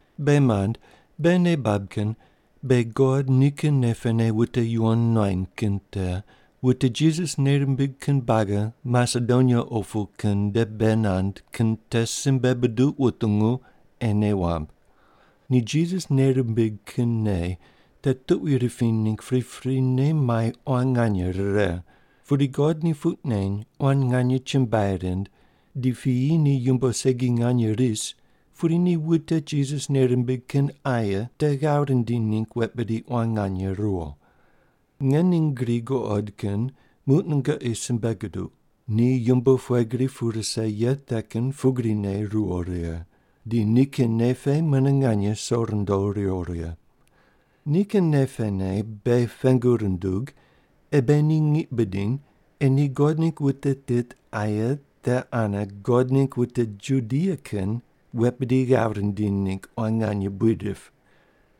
Beghi mand, beghi nei bab kin beghi God nikin nei pene wute yuwon nuany kin te wute Jisas nei rimbig kin buagi Masedonia opu kin nde bei nand kin te simbe buduq wutungu ei nei wamb. Ni Jisas nei rimbig kin nei te tuqui ripiny ningg priprine mai quan nganye rire, pudi God ni puq neny quan nganye chumbuai rind di piyi ni yumbo segi nganye ris pudi ni wute Jisas nei rimbig kin aye te ghav rindiny ningg wet bidi quan nganye ruwo. Nge ning gri guqod kin muq nungoqi simbe guduq, ni yumbo pughe gri pu rise ye te kin pugrine ruwo righe, di nikin nei pe mune nganye so rundo ruwo righe. Nikin nei pene beghi pengu rundug ei beghi ni ngiq bidiny ei ni God ningg wute tit aye te ane God ningg wute Judia kin wet bidi pe ghav rindiny ningg quan nganye buid rip.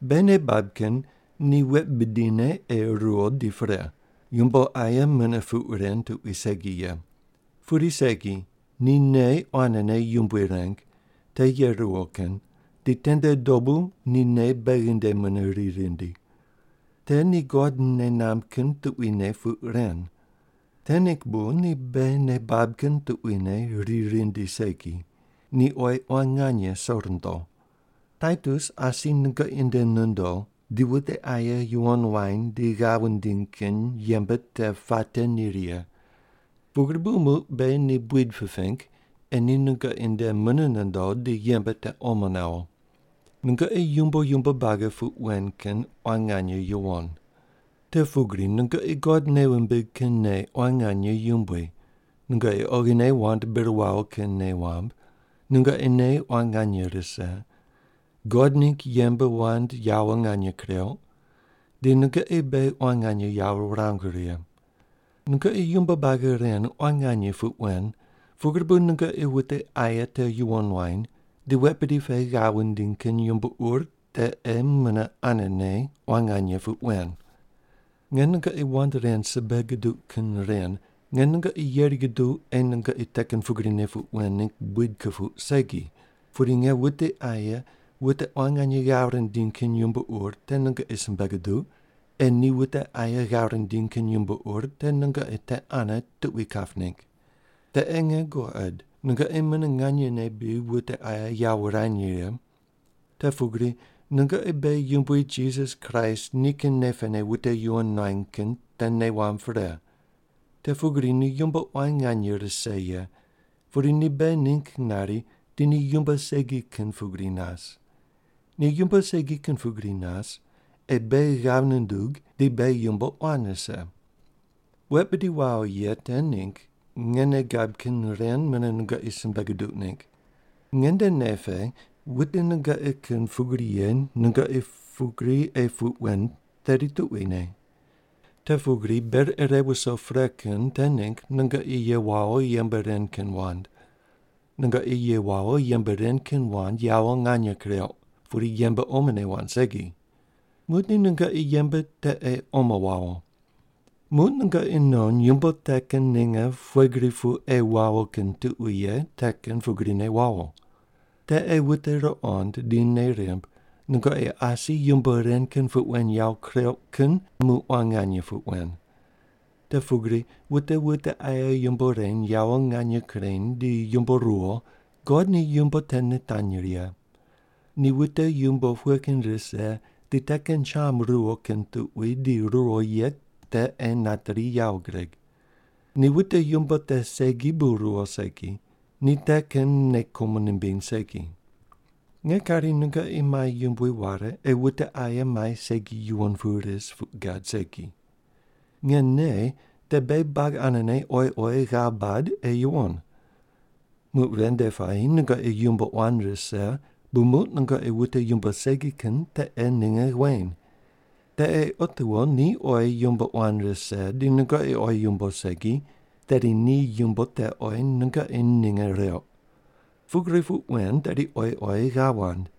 Beghi nei bab kin ni wet bidine ei ruwo di pre, yumbo aye mune puq ren tuqui segi ye. Pudi segi, ni nei quanene Yumbui reng, te ye ruwo kin, di tende dobu ni nei beghi nde mune ri rindi. Te ni God nei namb kin tuquine puq ren. Te ningg bu ni beghi nei bab kin tuquine ri rindi segi, ni oyi quan nganye so rundo. Taitus asi nungoqi nde nondo di wute aye yuwon wany di ghav wundiny kin yembe te puate ni righe. Pugri bu muq beghi ni buid piping ei ni nungoqi nde mune nondo di yembe te omo nawo. Nungoqi yumbo yumbo buagi puq wen kin quan nganye yuwon. Te pugri nungoqi God nei wumbig kin nei quan nganye yumbui, nungoqi oghine wand bir wawo kin nei wamb, nungoqi nei quan nganye rise, God ningg yembe wand yawo nganye kureuq, di nungoqi beghi quan nganye yawo wurangu righe. Nungoqi yumbo buagi ren quan nganye puq wen pugri bu nungoqi wute aye te yuwon wany di wet bidi pe ghav wundiny kin yumbo ur te ei mune anene quan nganye puq wen. Nge nungoqi wand ren simbe guduq kin ren nge nungoqi yeri guduq ei nungoqi te kin pugrine puq wen ningg buid kupuq segi, pudi nge wute aye wute quan nganye ghav rindiny kin yumbo ur te nungoqi simbe guduq ei ni wute aye ghav rindiny kin yumbo ur te nungoqi te ane tuqui kap ningg. Te ei nge guqod nungoqi mune nganyene bri wute aye yawo wurany righe. Te pugri nungoqi beghi Yumbui Jisas Kraist nikin nei pene wute yuwon nuany kin te nei wamb pre. Te pugri ni yumbo quan nganye rise ye, pudi ni beghi ningg nari di ni yumbo segi kin pugri nas. Ni yumbo segi kin pugri nas ei beghi ghav nundug di beghi yumbo quan rise. Wet bidi wawo ye te ningg nge nei gab kin ren mune nungoqi simbe guduq ningg. Nge nde nei pe wute nungoqi kin pugri ye nungoqi pugri ei puq wen tedi tuquine. Te pugri ber ire wuso pre kin te ningg nungoqi ye wawo yembe ren kin wand. Nungoqi ye wawo yembe ren kin wand yawo nganye kureuq, pudi yembe omone wand segi. Muqdi nungoqi yembe te ei omo wawo. Muq nungoqi non yumbo te kin ninge pughe gri pu ei wawo kin tuqui ye te kin pugrine wawo. Te ei wute ruqond di nei rimb nungoqi asi yumbo ren kin puq wen yawo kureuq kin muq quan nganye puq wen. Te pugri wute wute aye yumbo reny yawo nganye kureny di yumbo ruwo, God ni yumbo te nitanyri ye. Ni wute yumbo pughe kin rise di te kin cham ruwo kin tuqui di ruwo ye te ei nateri yawo gureg. Ni wute yumbo te segi bu ruwo segi, ni te kin nei kumo nimbiny segi. Nge kari nungoqi mai yumbui ware ei wute aye mai segi yuwon pu ris puq gad segi. Nge nei te beghi buagi anene oyi oyi ghav bad ei yuwon. Muq ven nde puayi nungoqi yumbo quan rise bu muq nungoqi wute yumbo segi kin te ei ninge weny. Te ei otiwo ni oyi yumbo quan rise di nungoqi oyi yumbo segi, tedi ni yumbo te oyi nungoqi ninge reuq. Pugri puq wen tedi oyi oyi ghav wand.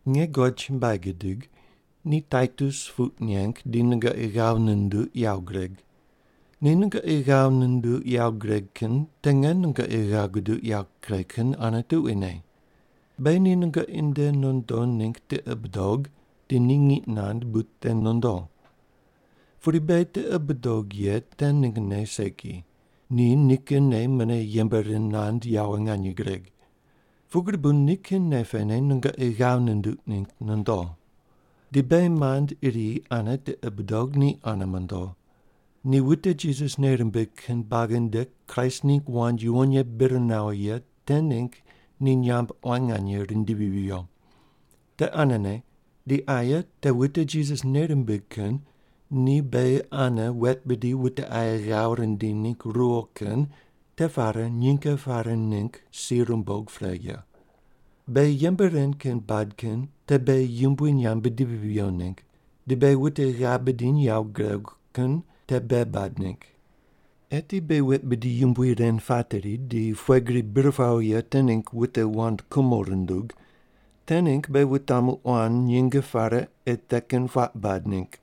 Nge God chumbuai gidig, ni Taitus puq neng di nungoqi ghav nunduq yawo gureg. Ni nungoqi ghav nunduq yawo gureg kin te nge nungoqi ghav guduq yawo kuregh kin ane tuquine. Beghi ni nungoqi nde nondo ningg tiqi budog di ni ngiq nand bu te nondo. Pudi beghi tiqi budog ye te ninggne segi, ni nikinne mune yembe ren nand yawo nganye gureg. Pugri bu nikin nei pene nungoqi ghav nunduq ningg nondo. Di beghi mand iri ane tiqi budog ni ane mondo. Ni wute Jisas nei rimbig kin buagi nde Kraist ningg wand yuwon ye bir nawo ye te ningg ni nyamb quan nganye rindivi viyo. Te anene di aye te wute Jisas nei rimbig kin ni beghi ane wet bidi wute aye ghav rindiny ningg ruwo kin te pare nyinge pare ningg si rumbog pre ye. Beghi yembe ren kin bad kin te beghi Yumbui nyamb bidivi viyo ningg, di beghi wute ghav bidiny yawo guregu kin te bei bad ningg. Eti beghi wet bidi yumbui ren pateri di pughe gri bir pawo ye te ningg wute wand kumo rundug, te ningg beghi wutamu quan nyinge pare ei te kin puaq bad ningg.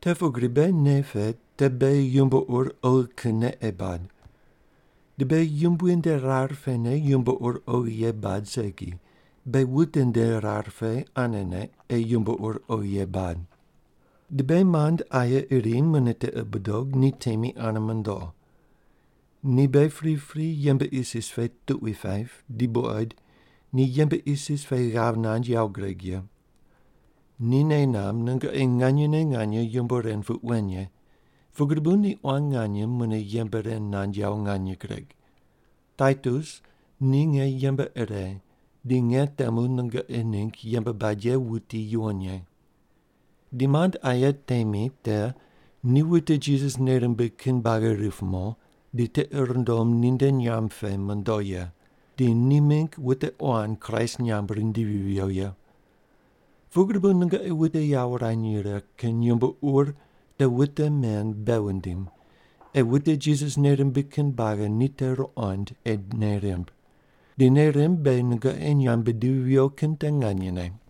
Te pugri beghi nei pe te beghi yumbo ur oghi kinne ei bad. Di beghi Yumbui nde rar pene yumbo ur oghi ye bad segi, beghi wute nde rar pe anene ei yumbo ur oghi ye bad. Di beghi mand aye iri mune tiqi budog ni temi ane mondo. Ni beghi pripri yembe isis pe tuqui paip di buqoid ni yembe isis pe ghav nand yawo gureg ye. Ni nei namb nungoqi nganyene nganye yumbo ren puq wen ye, pugri bu ni quan nganye mune yembe ren nand yawo nganye gureg. Taitus ni nge yembe ire di nge temu nungoqi ningg yembe bad ye wuti yuwon ye. Di mand aye temi te ni wute Jisas nei rimbig kin buagi rip mo di tiqi rundom ninde nyamb pe mondo ye, di ni mingg wute quan Kraist nyamb rindivi viyo ye. Pugri bu nungoqi wute yawo wurany righe kin yumbo ur te wute men bei wundim ei wute Jisas nei rimbig kin buagi ni te ruqond ei nei rimb, di nei rimb beghi nungoqi nyamb bidivi viyo kin te nganyene.